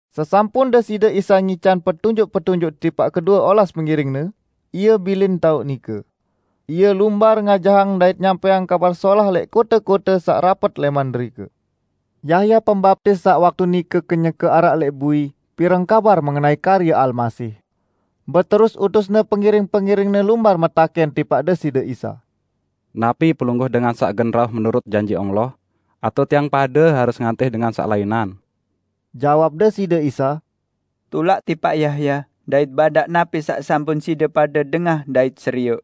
Sesampun Deside Isa ngican petunjuk-petunjuk tipaq kedue olas pengiring-Ne, Ie bilin taoq nike. Ie lumbar ngajahang dait nyampẽang Kabar Solah lẽq kote-kote saq rapet lẽman derike. Yahya Pembaptis saq waktu nike kenyeke araq lẽq bui pireng kabar mengenai karye Almasih. Beterus utusne pengiring-pengiringne lumbar metakẽn tipaq Deside Isa, "Napi Pelungguh dengan saq gen rauh menurut janji Allah, atao tiang pade harus ngantih dengan saq lainan?" Jawab Deside Isa, "Tulak tipaq Yahya dait badaq napi saq sampun side pade dengah dait serioq: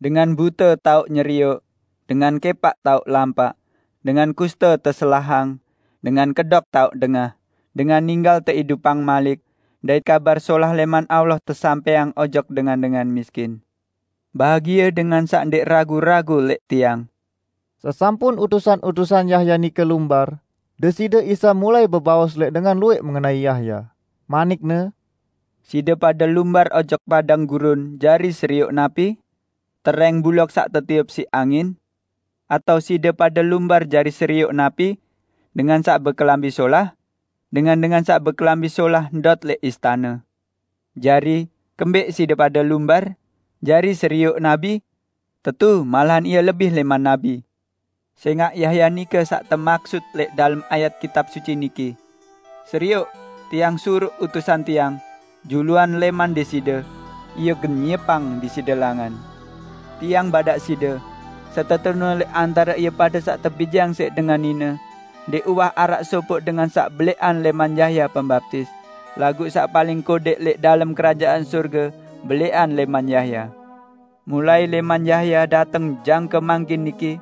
Dengan bute tao nyerioq, dengan kẽpaq tao lampaq, dengan kuste teselahang, dengan kedok tao dengah, dengan ninggal teidupang malik dait Kabar Solah lẽman Allah tesampẽang ojok dengan-dengan miskin. Bahagie dengan saq ndẽq ragu-ragu lẽq Tiang!" Sesampun utusan-utusan Yahya nike lumbar, Deside Isa mulai bebaos lẽq dengan luwẽq mengenai Yahya, manik-Ne, "Side pade lumbar ojok padang gurun jari serioq napi? Terẽng buloq saq tetiup siq angin? Atao side pade lumbar jari serioq napi? Dengan saq bekelambi solah? Dengan-dengan saq bekelambi solah ndot lẽq istane! Jari, kembẽq side pade lumbar? Jari serioq nabi? Tetu, malahan ie lebih lẽman nabi. Sẽngaq Yahya nike saq temaksut lẽq dalem ayat Kitab Suci niki: 'Serioq, Tiang suruq utusan Tiang, juluan lẽman Deside, ie gen nyiepang Deside langan.' Tiang badaq side: Setetune lẽq antare ie pade saq tebijeang siq dengan nine ndẽq uwah araq sopoq dengan saq belẽqan lẽman Yahya Pembaptis, laguq saq paling kodẽq lẽq dalem Kerajaan Sorge belẽqan lẽman Yahya. Mulai lẽman Yahya dateng jangke mangkin niki,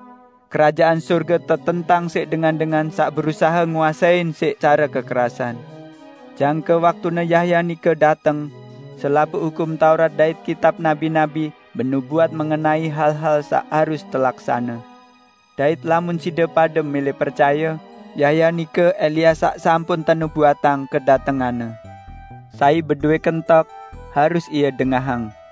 Kerajaan Sorge tetentang siq dengan-dengan saq berusahe nguasein siq care kekerasan. Jangke waktune Yahya nike dateng, selapuq Hukum Taurat dait kitab nabi-nabi benubuat mengenai hal-hal saq harus telaksane. Dait lamun side pade mẽlẽ percaye, Yahya nike Elia saq sampun tenubuatang kedatenganne. Sai bedowẽ kentok, harus ie dengahang!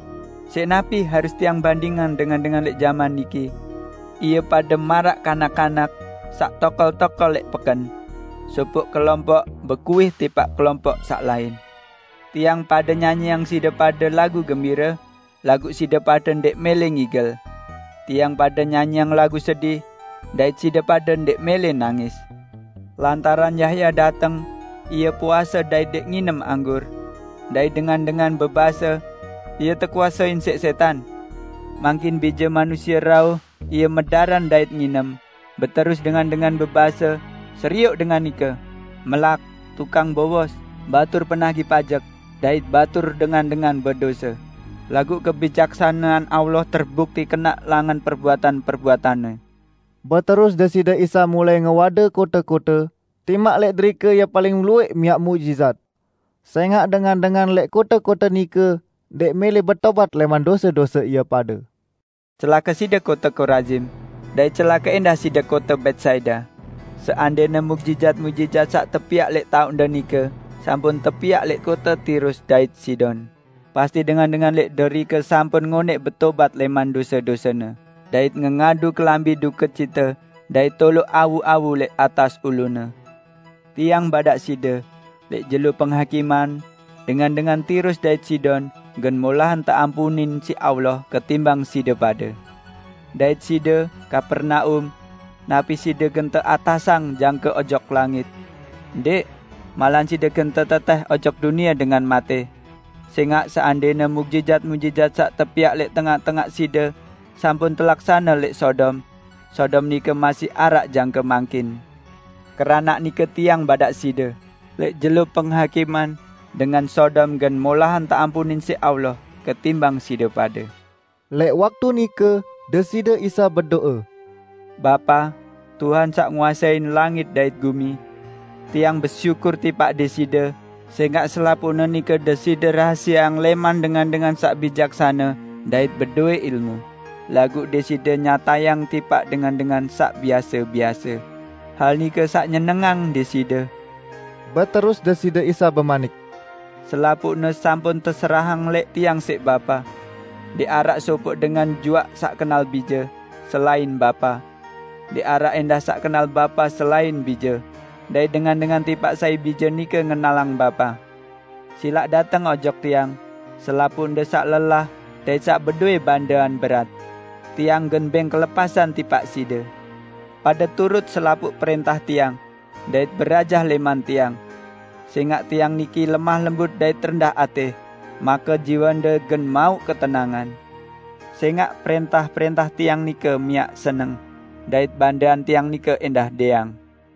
Siq napi harus Tiang bandingang dengan-dengan lẽq jaman niki? Ie pade maraq kanak-kanak saq tokol-tokol lẽq peken. Sopoq kelompoq bekuih tipaq kelompoq saq lain, 'Tiang pade nyanyiang side pade lagu gembire, laguq side pade ndẽq mẽlẽ ngigel! Tiang pade nyanyiang lagu sedih, dait side pade ndẽq mẽlẽ nangis!' Lantaran Yahya dateng -- ie puase dait ndẽq nginem anggur; dait dengan-dengan bebase, 'ie tekuasein siq sẽtan.' Mangkin Bije Manusie, rauh -- Ie medaran dait nginem; beterus dengan-dengan bebase, 'Serioq dengan nike! Melak, tukang bowos, batur penagih pajek dait batur dengan-dengan bedose.' Laguq hikmat Allah terbukti kenaq langan perbuatan-perbuatanne." Beterus Deside Isa mulai ngewade kote-kote, timaq lẽq derike Ie paling luwẽq miaq muqjizat. Sẽngaq dengan-dengan lẽq kote-kote nike ndẽq mẽlẽ betobat lẽman dose-dose ie pade. "Celake side kote Korazim! Dait celake ẽndah side kote Betsaida! Seandẽne muqjizat-muqjizat saq tepiaq lẽq taoqde nike sampun tepiaq lẽq Tirus dait Sidon, pasti dengan-dengan lẽq derike sampun ngonẽq betobat lẽman dose-dosene dait ngengadu kelambi dukecite dait toloq awu-awu lẽq atas ulune. Tiang badaq side, lẽq jelo Penghakiman, dengan-dengan Tirus dait Sidon gen molahan teampunin siq Allah ketimbang side pade! Dait side, Kapernaum! Napi side gen teatasang jangke ojok langit? Ndẽq! Malahan side gen tetetẽh ojok dunie dengan matẽ! Sẽngaq seandẽne muqjizat-muqjizat saq tepiaq lẽq tengaq-tengaq side sampun telaksane lẽq Sodom, Sodom nike masih araq jangke mangkin! Keranaq nike Tiang badaq side, lẽq jelo Kiamat, dengan Sodom gen molahan teampunin siq Allah ketimbang side pade!" Lẽq waktu nike Deside Isa bedo'e, "Bapa, Tuhan saq nguasein langit dait gumi! Tiang besyukur tipaq Deside sẽngaq selapuqne nike Deside rahasieang lẽman dengan-dengan saq bijaksane dait pinter. Laguq Deside nyatayang tipaq dengan-dengan saq biase-biase. Hal nike saq nyenengang Deside." Beterus Deside Isa bemanik, "Selapuqne sampun teserahang lẽq Tiang siq Bapa. Ndẽq araq sopoq dengan juaq saq kenal Bije, selain Bapa. Ndẽq araq ẽndah saq kenal Bapa selain Bije, dait dengan-dengan tipaq sai Bije nike ngenalang Bapa. Silaq dateng ojok Tiang selapuqde saq lelah dait saq bedowẽ bandean berat; Tiang gen bẽng kelepasan tipaq side. Pade turut selapuq prẽntah Tiang, dait berajah lẽman Tiang. Sẽngaq Tiang niki lemah lembut dait rendah atẽ, make jiwende gen mauq ketenangan. Sẽngaq prẽntah-prẽntah Tiang nike miaq seneng dait bandean Tiang nike ẽndah dẽang."